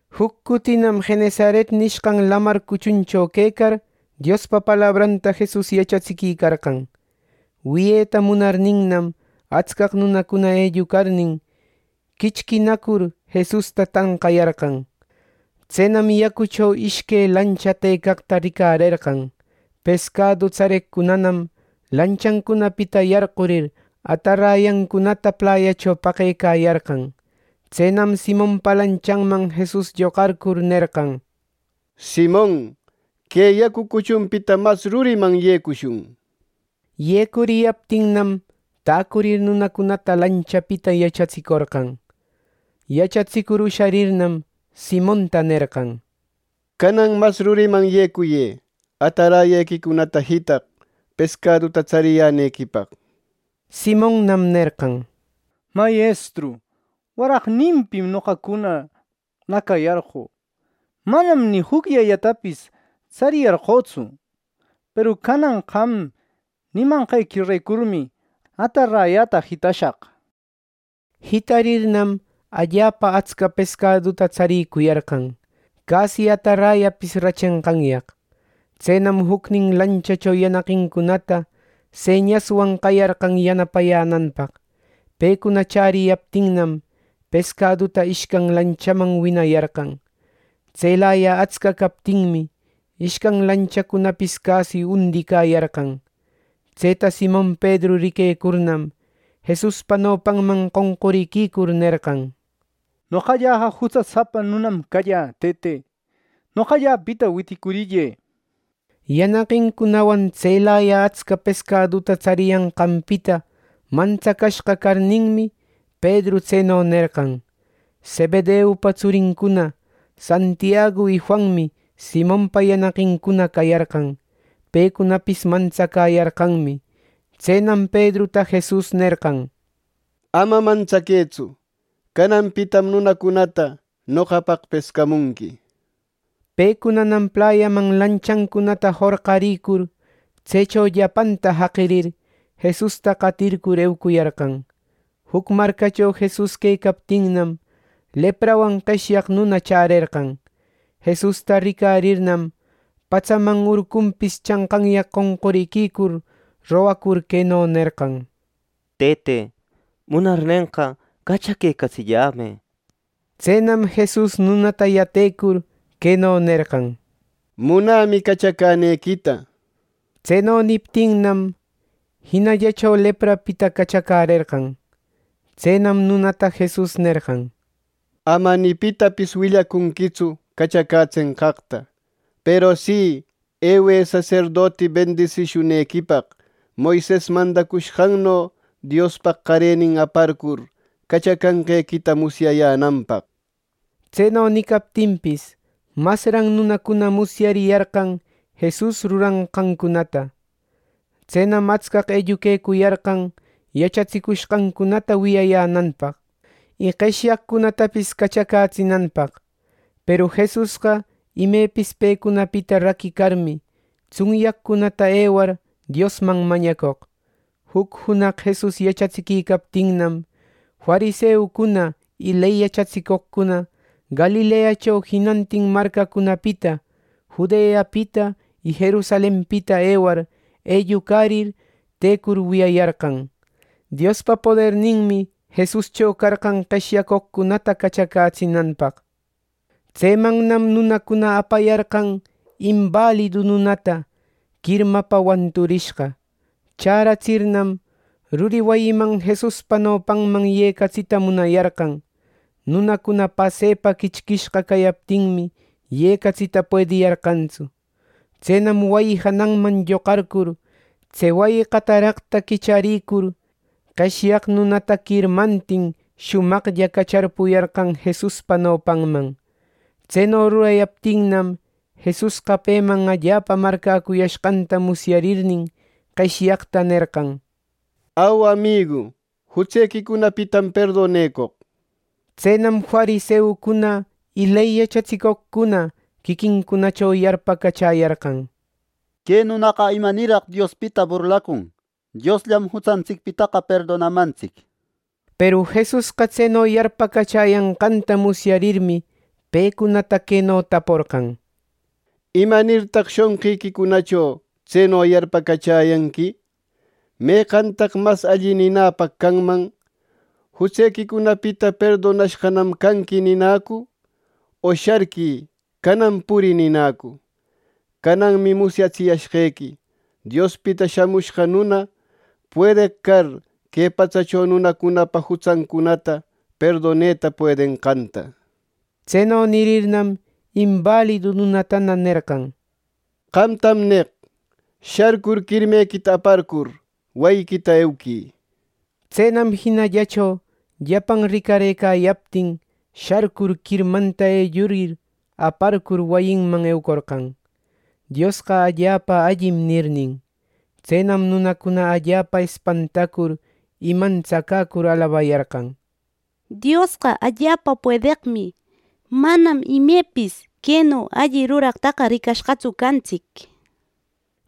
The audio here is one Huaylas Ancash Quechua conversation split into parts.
Juc cutinam Genesaret nishqan Lamar cuchuncho quecar Diospa palabranta Jesus yachatsiquicarqan. Wiyeta munarninnam, atscaq nunacuna ellucarnin, quichquinacur Jesusta tanqayarqan. Tsenam yacucho ishque lancha tëcaqta ricarerqan. Pescadu tsareqcunanam lanchancunapita yarqurir, atarayancunata playacho paqecayarqan. Tsenam Simonpa lanchanman Jesus lloqarcur nerqan: —Simon, que yacu cuchunpita mas ruriman yecushun —nir. Yecuriyaptinnam, täcurir, nunacunata lanchapita yachatsicorqan. Yachatsicur usharirnam, Simonta nerqan: —Canan mas ruriman yecuyë atarayequicunata jitaq, pescaduta tsariyänequipaq. Simonnam nerqan: —Mayestru, waraqninpim noqacuna nacayarqö. Manam ni jucllellatapis tsariyarqötsu. Peru canan qam nimanqequirecurmi, atarayäta jitashaq —nir. Jitarirnam, allapa atsca pescaduta tsaricuyarqan, casi atarayapis rachenqanyaq. Tsenam jucnin lanchacho yanaqincunata señaswan qayarqan yanapayänanpaq. Pecuna chäriyaptinnam, pescaduta ishcan lanchaman winayarqan. Tselaya atsca captinmi, ishcan lanchacunapis casi jundicayarqan. Tseta Simon Pedru riquecurnam, Jesuspa nopanman qonqurïcur, nerqan: —Noqalläqa jutsasapa nunam callä, Tëte. Noqallapita witicurillë. Yanaqincunawan tselaya atsca pescaduta tsariyanqanpita mantsacashqa carninmi, Pedru tseno nerqan. Zebedeupa tsurincuna Santiagu y Juanmi Simonpa yanaqincuna cayarqan. Pecunapis mantsacäyarqanmi. Tsenam Pedruta Jesus nerqan: —Ama mantsaquëtsu. Cananpitam nunacunata noqapaq pescamunqui. Pecunanam playaman lanchancunata jorqarïcur, tsecho llapanta jaqirir, Jesusta qatircur eucuyarqan. Juc marcacho Jesus quecaptinnam, leprawan qeshyaq nuna chärerqan. Jesusta ricarirnam, patsaman urcunpis chanqanyaq qonquriquicur rogacur, queno nerqan: —Tëte, munarnenqa, cachaquecatsillämë —nir. Tsenam Jesus nunata yatecur queno nerqan: —Munämi, cachacänequita. Tseno niptinnam, jinallacho leprapita cachacärerqan. Tsenam nunata Jesus nerqan: —Ama ni pitapis willacunquitsu cachacätsenqaqta. Peru si, ewë saserdoti bendisishunequipaq, Moises mandacushqanno Diospaq qarenin aparcur cachacashqequita musyayänanpaq. Tseno nicaptinpis, masran nunacuna musyariyarqan Jesus ruranqancunata. Tsenam atscaq elluquecuyarqan yachatsicushqancunata wiyayänanpaq, y qeshyaqcunatapis cachacätsinanpaq. Peru Jesusqa imepis pecunapita raquicarmi, tsunyaqcunata ewar, Diosman mañacoq. Juc junaq Jesus yachatsiquicaptinnam, fariseucuna y ley yachatsicoqcuna Galileacho jinantin marcacunapita, Judeapita y Jerusalenpita ewar, ellucarir tëcur, wiyayarqan. Diospa poderninmi Jesuscho carqan qeshyacoqcunata cachacätsinanpaq. Tsemannam nunacuna apayarqan imbalidu nunata quirmapa wanturishqa. Chäratsirnam, ruri wayiman Jesuspa nopanman yecatsita munayarqan. Nunacuna pasepa quichquishqa cayaptinmi, yecatsita puediyarqantsu. Tsenam wayi jananman lloqarcur, tse wayi qataraqta quicharicur, qeshyaq nunata quirmantin shumaqlla cacharpuyarqan Jesuspa nopanman. Tseno rurayaptinnam, Jesusqa peman allapa marcäcuyashqanta musyarirnin, qeshyaqta nerqan: —Au, amigu, jutsequicunapitam perdonecoq. Tsenam fariseucuna y ley yachatsicoqcuna quiquincunacho yarpacachäyarqan: “Que nunaqa ¡imanirraq Diospita burlacun! Diosllam jutsantsicpitaqa perdonamantsic” nir. Peru Jesusqa tseno yarpacachäyanqanta musyarirmi, pecunata queno taporqan: —¿Imanirtaq shonqiquicunacho tseno yarpacachäyanqui! ¿Meqantaq mas alli ninäpaq canman: ‘Jutsequicunapita perdonashqanam canqui’ ninäcu, o ‘¡Sharquï! ¡Canan purï!’ ninäcu! Cananmi musyatsiyashqequi Diospita Shamushqa Nuna, puedeq car que patsacho nunacunapa jutsancunata perdoneta puedenqanta. Tseno nirirnam, imbalidu nunatana nerqan: —Qamtam neq: Sharcur quirmequita aparcur wayiquita euquï. Tsenam jinallacho llapan ricarëcayaptin, sharcur, quirmanta ellurir aparcur, wayinman eucorqan, “Diosqa allapa allim” nirnin. Tsenam nunacuna allapa espantacur y mantsacäcur, alabayarqan: —¡Diosqa allapa puedeqmi! ¡Manam ni imepis queno alli ruraqtaqa ricashqatsu cantsic! —nishpa.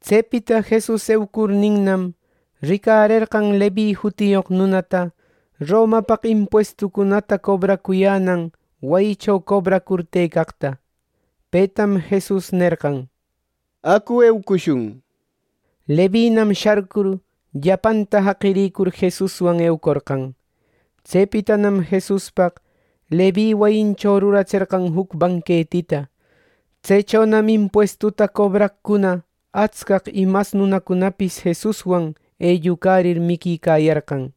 Tsepita Jesus eucurninnam, ricarerqan Levi jutiyoq nunata Romapaq impuestucunata cobracuyänan wayicho cobracur tëcaqta. Petam Jesus nerqan: —¡Acu eucushun! —nir. Levinam sharcur, llapanta jaqirïcur, Jesuswan eucorqan. Tsepitanam Jesuspaq Levi wayincho ruratserqan juc banquetita. Tsechonam impuestuta cobraqcuna atscaq y mas nunacunapis Jesuswan ellucarir, miquicayarqan.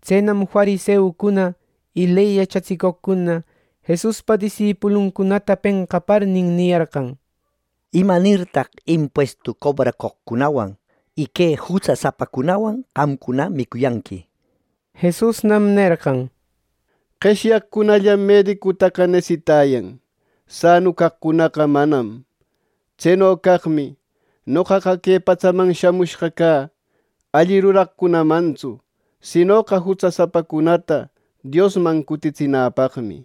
Tsenam, fariseucuna y ley yachatsicoqcuna Jesuspa disipuluncunata penqaparnin, niyarqan: —¿Imanirtaq impuestu cobracoqcunawan y que jutsasapacunawan qamcuna micuyanqui! Jesusnam nerqan: —Qeshyaqcunallam medicutaqa nesitayan; sanu caqcunaqa manam. Tseno caqmi noqaqa que patsaman shamushqa cä alli ruraqcunamantsu, sinoqa jutsasapacunata Diosman cutitsinäpaqmi.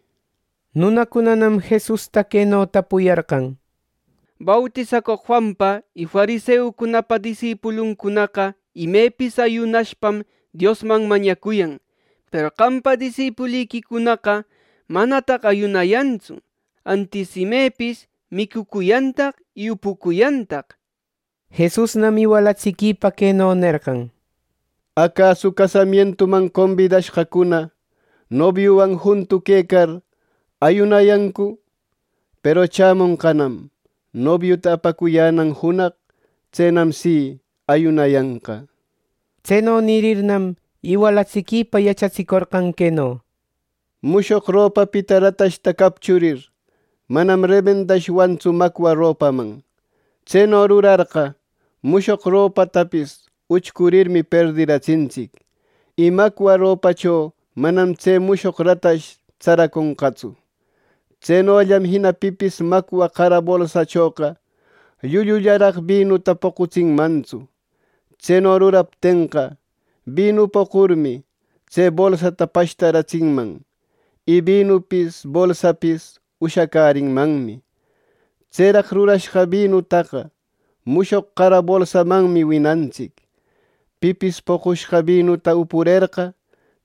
Nunacunanam Jesusta queno tapuyarqan: —Bautisacoq Juanpa y fariseucunapa disipuluncunaqa imepis ayunashpam Diosman mañacuyan; peru qampa disipuliquicunaqa ¡manataq ayunayantsu, antis imepis micucuyantaq y upucuyantaq! Jesusnam iwalatsiquipa queno nerqan: —Acasu casamientuman combidashqacuna nobiuwan juntu quecar, ¿ayunayancu? Peru chämonqanam nobiuta apacuyänan junaq. Tsenam si, ayunayanqa. Tseno nirirnam, iwalatsiquipa yachatsicorqan queno: —Mushoq ropapita ratashta capchurir, manam remendashwantsu macwa ropaman. Tseno rurarqa, mushoq ropatapis uchcurirmi perdiratsintsic, y macwa ropacho manam tse mushoq ratash tsaraconqatsu. Tsenollam jina pipis macwa qara bolsachoqa llullullaraq binuta poqutsinmantsu. Tseno ruraptenqa, binu poqurmi, tse bolsata pashtaratsinman, y binupis bolsapis ushacärinmanmi. Tseraq rurashqa binutaqa mushoq qara bolsamanmi winantsic. Pipis poqushqa binuta upurerqa,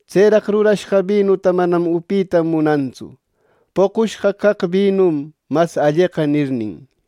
tseraq rurashqa binuta manam upita munantsu, ‘Poqushqa caq binum mas alleqa’ nirnin.